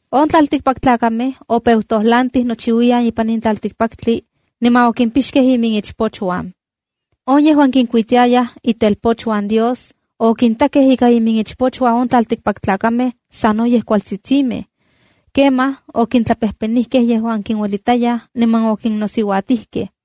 On tlaltikpaktlakamej opeu tojlantij nochiuiyan ipan in tlaltikpaktli niman okimpixkej iminichpochuan. On yejuan kinkuitiayaj itelpochuan Diosa X” okintakej ika iminichpochuan on tlaltikpaktlakamej sanoyej kualtsitsimej. Kemaj okintlapejpenijkej yejuan kinuelitayaj niman okinnosiuatijkej.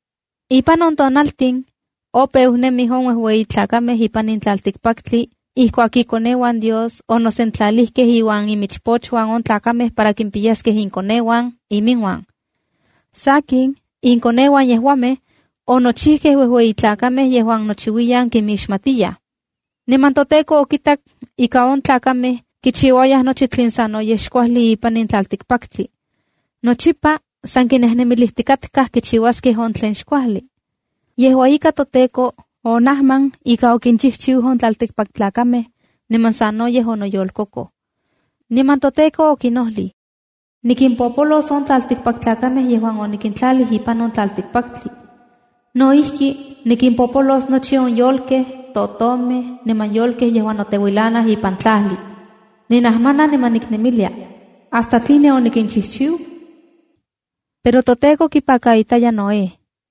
Ipan on tiempo opeu nemij on uejueyi tlakamej ipan in tlaltikpaktli ijkuak “ikoneuan Dios” onosentlalijkej iuan iminichpochuan on tlakamej para kimpiyaskej inkoneuan iminuan. Sakin, inkoneuan yejuamej onochijkej uejueyi tlakamej yejuan nochiuiyan kinmixmatiyaj. Niman toTEKO okitak ika on tlakamej kichiuayaj nochi tlen sanoyej xkuajli ipan in tlaltikpaktli. Nochipa san kinejnemilijtikatkaj kichiuaskej on tlen xkuajli. Yejua ika, toTEKO onajman ika okinchijchiu on tlaltikpaktlakamej, niman sanoyej onoyolkokoj. Niman toTEKO okinojlij: “Nikimpopolos on tlaltikpaktlakamej yejuan oninkintlalij ipan on tlaltikpaktli. No ijki, nikimpopolos nochi on yolkej, totomej niman yolkej yejuan noteuilanaj ipan tlajli. Ninajmana niman niknemilia: ¿Hasta tline onikinchijchiu?” Pero toTEKO kipakaitaya Noé.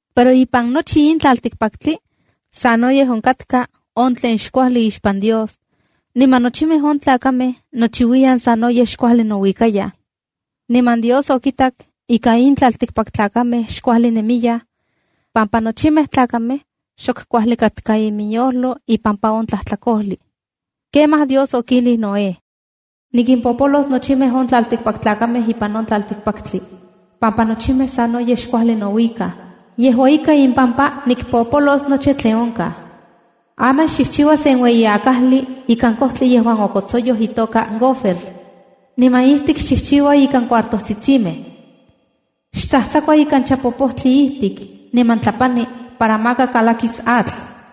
Pero ipan nochi in tlaltikpaktli, sanoyej onkatka on tlen xkuajli ixpan Dios, niman nochimej on tlakamej nochiuiyan sanoyej xuajli nouikayaj. Niman Dios okitak ika in tlaltikpaktlakamej xkuajli nemiyaj, pampa nochi tlakatl xok kuajli ipan iminyojlo ipampa on tlajtlakojli. Kemaj Dios okijlij Noé: “Nikimpopolos nochimej on tlaltikpaktlakamej ipan in tlaltikpaktli pampa nochimej sanoyej xkuajli nouikaj. Yejua ika, impampa nikpopolos nochi tlen onkaj. Aman xchijchiua sen ueyi akajli ikan kojtli yejuan okotsoyoj itoka gofer, niman ijtik xchijchiua ikan cuartojtsitsimej. Xtsajtsakua ikan chapopojtli ijtik, niman tlapani para maka kalakis atl.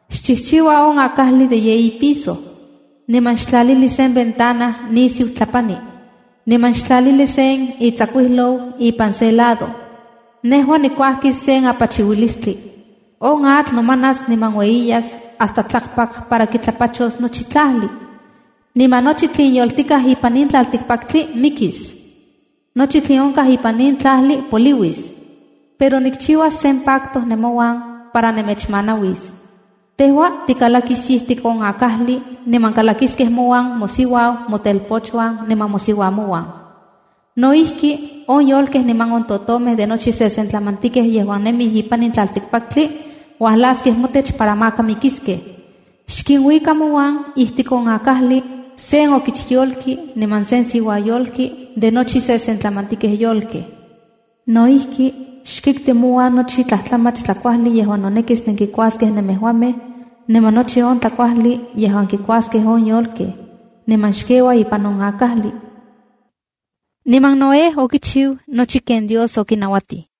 Xchijchiua on akajli de yeyi piso, niman xtlalili sen ventana nisiu tlapani. Niman xtlalili sen itsakuijlou ipan se lado. Nejua nikuajkis sen apachiuilistli. On atl nomanas niman ueyiyas hasta tlakpak para kitlapachos nochi tlajli, niman nochi tlen yoltikaj ipan in tlaltikpaktli mikis. Nochi tlen onkaj ipan in tlajli poliuis. Pero nikchiuas sen pacto nemouan para nemechmanauis. Tejua tikalakis ijtik on akajli niman kalakiskej mouan mosiuau, motelpochuan niman mosiuamouan. No ijki, on yolkej niman totomej de nochi sesentlamantikej yejuan nemij ipan in tlaltikpaktli uajlaskej motech para maka mikiskej. Xkinuika mouan ijtik on akajli, sen okichyolki niman sen siuayolki de nochi sesentlamantikej yolkej. No ijki, xkikti mouan nochi tlajtlamach tlakuajli yejuan nonekis nenkikuaskej nemejuamej niman nochi tlakuajli yejuan tlakuaskej on yolkej niman xkeua ipan on akajli.” Niman Noé okichiu nochi ken Dios okinauatij.